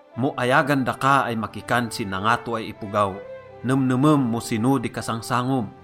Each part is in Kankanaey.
Mo ayagan daka ay makikan si nangato ay ipogaw, nemnemem mo sino di kasangsangom.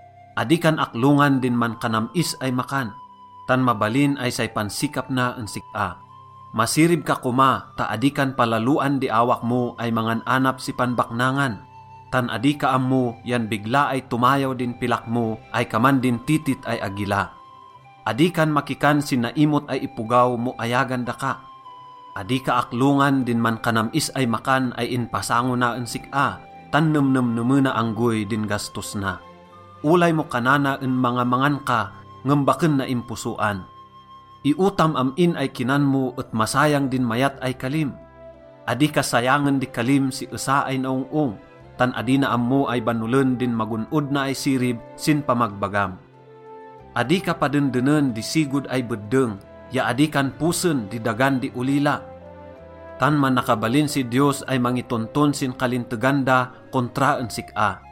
Adi kan aklongan din mankanam-is ay makan, tan mabalin ay say pansikap na en sik-a. Masirib ka koma ta adi kan palaloan di awak mo ay mangan-anap si panbaknangan. Tan adi ka ammo yan bigla ay tomayaw din pilak mo ay kaman din titit ay agila. Adi kan makikan si naimot ay ipogaw mo ayagan daka. Adi ka aklongan din mankanam-is ay makan ay inpasango na en sik-a, tan nemnemnemena anggoy din gastos na. Olay mo kanana en mangamangan ka ngem baken naimposoan. Iotam am-in ay kinan mo et masayang din mayat ay kalim. Adi ka sayangen di kalim si esa ay naong-ong, tan adi na ammo ay banolen din magon-od na ay sirib sin pamagbagam. Adi ka padendenen di sigod ay beddeng ya adi kan posen di dagan di olila, tan manakabalin si Diyos ay mangitonton sin kalintegan da kontra en sik-a.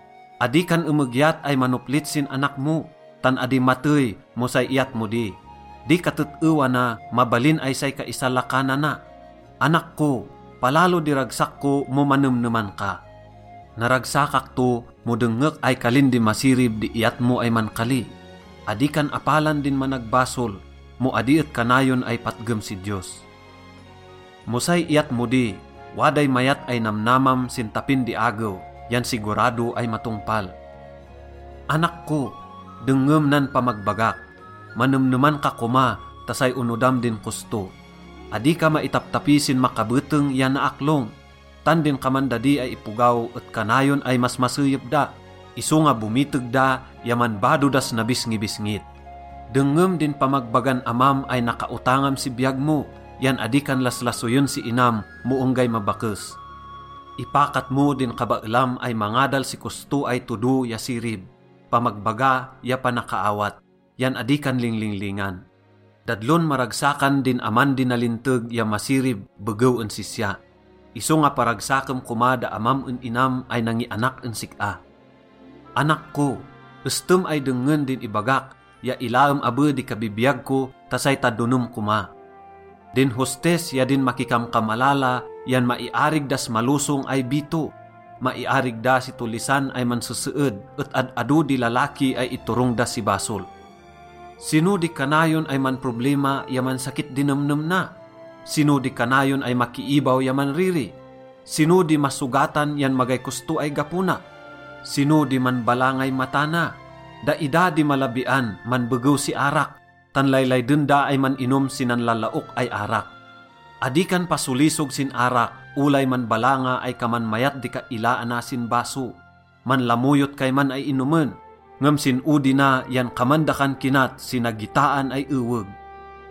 Adi kan emegyat ay manoplit sin anak mo, tan adi matey mo say iyat mo di. Di katet-ewa na, mabalin ay say kaisalakanana. Anak ko, palalo di ragsak ko mo manemneman ka. Naragsakak to mo dengngek ay kalin di masirib di iyat mo ay mankali. Adi kan apalan din managbasol mo adi et kanayon ay patgem si Diyos. Mo say iyat mo di, waday mayat ay namnamam sin tapin di agew yan sigurado ay matongpal. Anak ko, dengngem nan pamagbagak. Manemneman ka koma ta say onodam din kosto. Adi ka maitaptapi sin makabeteng ya naaklong. Tan din kaman dadi ay ipogaw et kanayon ay masmaseyep da, isonga bomiteg da ya manbado das nabisngibisngit. Dengngem din pamagbagan amam ay nakaotangam si biyag mo yan adi kan laslasoyen si inam mo enggay mabakes. Ipakat mo din kabaelam ay mangadal si kosto ay todo ya sirib, pamagbaga ya panakaawat, yan adi kan linglinglingan. Dadlon maragsakan din aman di nalinteg ya masirib begew en sisya. Isonga paragsakem koma da amam en inam ay nangianak en sik-a. Anak ko, estem ay dengngen din ibagak ya ilaem abe di kabibiyag ko ta say tadonem koma. Din hostess ya din makikamkamalala yan maiarig das malosong ay bito. Maiarig da si tollisan ay manseseed et ad-ado di lalaki ay iturong da si basol. Sino di kanayon ay manproblima ya mansakit di nemnem na? Sino di kanayon ay makiibaw ya manriri? Sino di masogatan yan magay kosto ay gapo na? Sino di manbalangay mata na? Daida di malabian manbegew si arak, tan laylayden da ay man-inom si nanlalaok ay arak. Adi kan pasolisog sin arak olay manbalanga ay kaman mayat di kailaana sin baso. Manlamoyot kayman ay inomen, ngem sin odi na yan kaman dakan kinat si nagitaan ay eweg.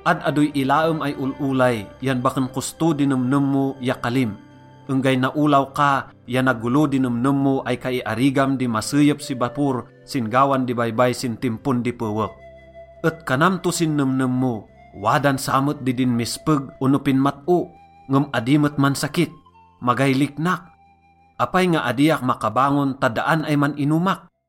Ad-adoy ilaem ay ol-olay yan baken kosto din nemnem mo ya kalim. Enggay naolaw ka ya nagolo di nemnem mo ay kaiarigam di maseyep si bapor sin gawan di baybay sin timpon di pewek. Et kanam to si nemnem mo, “Wadan samet di dinmespeg ono pinmat-o, ngem adi met mansakit. Magay liknak. Apay nga adiak makabangon ta daan ay man-inomak?”